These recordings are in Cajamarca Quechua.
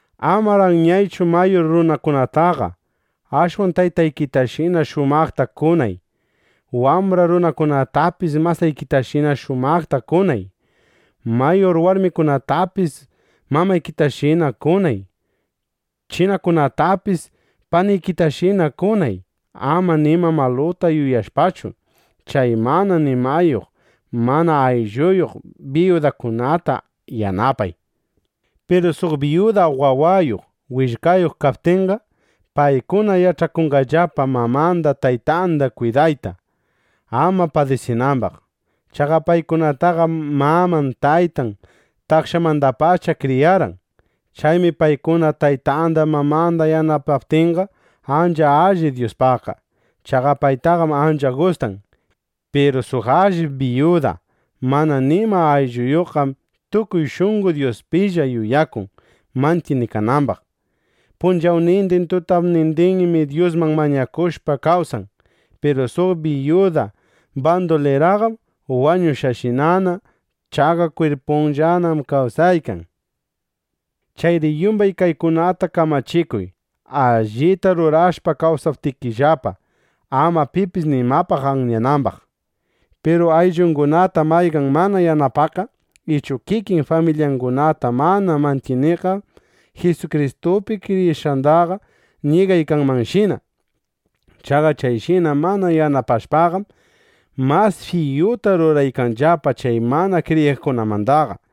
Amar anyaychu mayur runakunataqa; ashwan taytaykitashina shumaqta kunay. Wambra runakunatapis masaykitashina shumaqta kunay. Mayur warmikunatapis mamaykitashina kunay. Chinakunatapis panikitashina kunay, ama nima maluta yuyashpachu. Chay mana nimayuq mana aylluyuq biyudakunata yanapay. Piru suq biyuda wawayuq, willkayuq kaptinqa, paykuna yach'akunqallapa mamanda taytanda kwidayta, ama padisinambaq. Chaqa paykunataqam maman taytan takshanmandapacha kriyarqan. Chaymi paykuna taytanda, mamanda yanapaptinqa, ancha alli Dyuspaqqa. Chaqa paytaqam ancha gustan. Piru suq allip biyuda mana nima aylluyuqqam tukuy shunqo Dyuspilla yuyakun mantyinikanambaq. Punchawnindin, tutapnindinmi Dyusman mañakushpa kawsan. Piru suq biyuda banduliraqam wañushqashinana. Chaqa kwirpunllanam kawsaykan. Chayri yumbay kaykunata kamachikuy, allita rurashpa kawsaptinllapa, ama pipis nimapaq anyanambaq. Piru ayllungunata mayqan mana yanapaqqa ichu kikin familyangunata mana mantyiniqqam Jisukristupi kriyishqandaqa ñigaykanmanshina. Chaqa chayshina mana yanapashpaqam, mas fiyuta ruraykanllapa chay mana kriyiqkunamandaqa.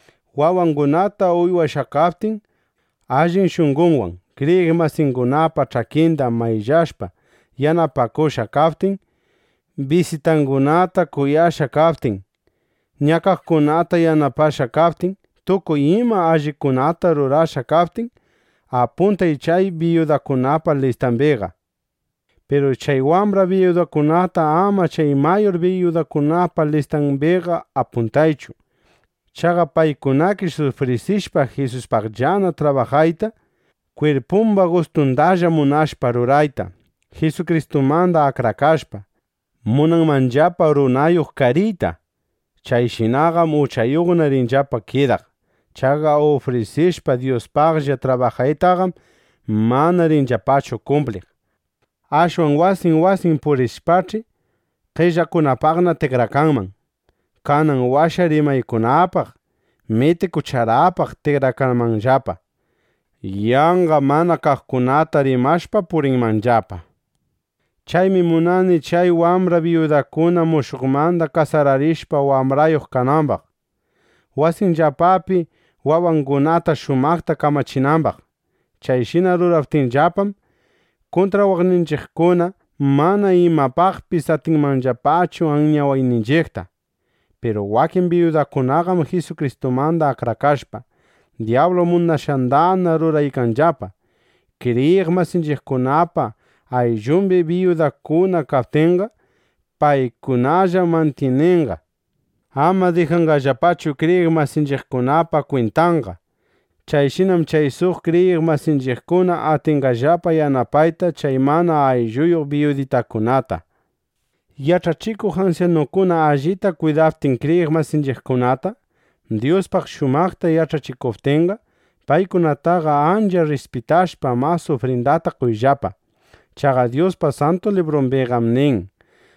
Wawangunata uywashqa kaptin, allin shunqonwan kriyiq masingunapa ch'akinda mayllashpa yanapakushqa kaptin, bisitangunata kuyashqa kaptin, ñakaqkunata yanapashqa kaptin, tukuy ima allikunata rurashqa kaptin, apuntay chay biyudakunapa listambiqa. Piru chay wambra biyudakunata ama chay mayur biyudakunapa listambiqa apuntaychu. Chaqa paykunakish ufrisishpa Jisuspaqllana trabajayta, kwirpumba gustundalla munashpa rurayta, Jisukristumanda akrakashpa, munanmanllapa runayuq kariyta. Chayshinaqam uchayuqna rinllapa kidaq. Chaqa ufrisishpa Dyuspaqlla trabajaytaqam, mana rinllapachu kumpliq. Ashwan wasin wasin purishpach'i, qellakunapaqna tikrakanman. Kanan washa rimaykunapaq, mitikucharapaq tikrakanmanllapa. Yanqa mana kaqkunata rimashpa purinmanllapa. Chaymi munani chay wambra biyudakuna mushuqmanda kasararishpa, wambrayuq kanambaq, wasinllapapi wawangunata shumaqta kamachinambaq. Chayshina ruraptinllapam, kuntrawaqninchiqkuna mana imapaqpis atinqallapachu anyawayninchiqta. Piru wakin biyudakunaqam Jisukristumanda akrakashpa, dyablu munashqandana ruraykanllapa. Kriyiq masinchiqkunapa ayllumbi biyudakuna kaptinqa, paykunalla mantyininqa. Ama dijanqallapachu kriyiq masinchiqkunapa kwintanqa. Chayshinam chay suq kriyiq masinchiqkuna atinqallapa yanapayta chay mana aylluyuq biyuditakunata. Yach'achikuq ansyanukuna allita kwidaptin kriyiq masinchiqkunata, Dyuspaq shumaqta yach'achikuptinqa, paykunataqa ancha rrispitashpa, mas ufrindata qoyllapa. Chaqa Dyuspa Santu Librumbiqam nin: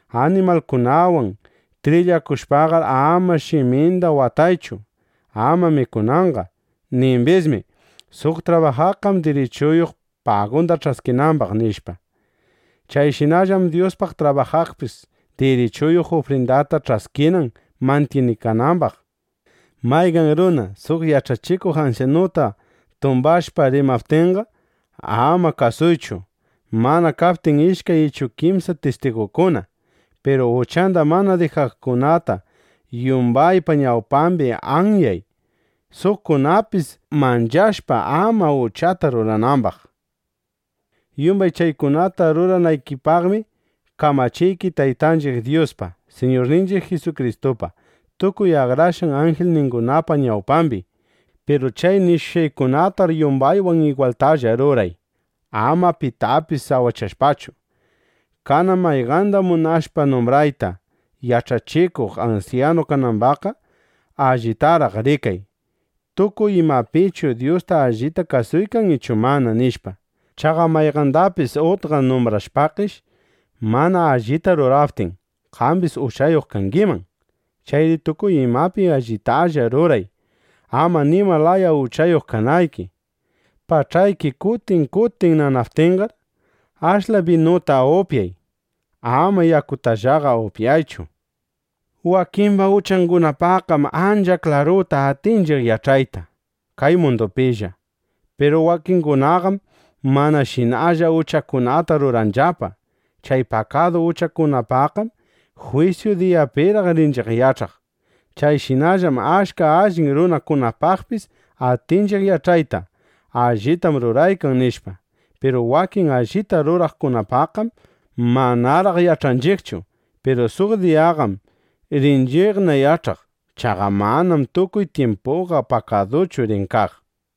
“Animalkunawan trillakushpaqar ama shiminda wataychu, ama mikunanqa”. Nimbismi: “Suq trabajaqqam dirichuyuq, pagunda ch'askinambaq”, nishpa. (Chayshinallam Dyuspaq trabajaqpis dirichuyuq, ufrindata ch'askinan mantyinikanambaq.) Mayqan runa suq yach'achikuq ansyanuta tumbashpa rimaptinqa, ama kasuychu, mana kaptin ishkay ichu kimsa tistigukuna. Piru uchanda mana dijaqkunata yumbaypa ñawpambi anyay, suqkunapis manchashpa, ama uchata ruranambaq. Yumbay chaykunata ruranaykipaqmi kamachiyki Taytanchiq Dyuspa, Siñurninchiq Jisukristupa, tukuy akrashqan anjilningunapa ñawpambi. Piru chay nishushqaykunatar yumbaywan igwaltalla ruray, ama pitapis sawachashpachu. Kanan mayqanda munashpa numbrayta yach'achikuq ansyanu kanambaqqa, allitaraq rikay: Tukuy imapichu Dyusta allita kasuykan ichu mana, nishpa. Chaqa mayqandapis utqa numbrashpakish, mana allita ruraptin, qambis uchayuq kangiman. Chayri tukuy imapi allitalla ruray, ama nima laya uchayuq kanayki. Pach'ayki kutin kutin nanaptinqar, ashla binuta upyay. Ama yakutallaqa upyaychu. Wakimba uchangunapaqqam ancha klaruta atinchiq yach'ayta kay mundupilla. Piru wakingunaqam manashinalla uchakunata ruranllapa. Chay pakadu uchangunapaqqam jwisyu diyapiraq rinchiq yach'aq. Chayshinallam achka allin runakunapaqpis atinchiq yach'ayta: Allitam ruraykan, nishpa. Piru wakin allita ruraqkunapaqqam manaraq yach'anchiqchu. Piru suq diyaqam rinchiqna yach'aq. Chaqa manam tukuy tyimpuqa pakaduchu rin kaq.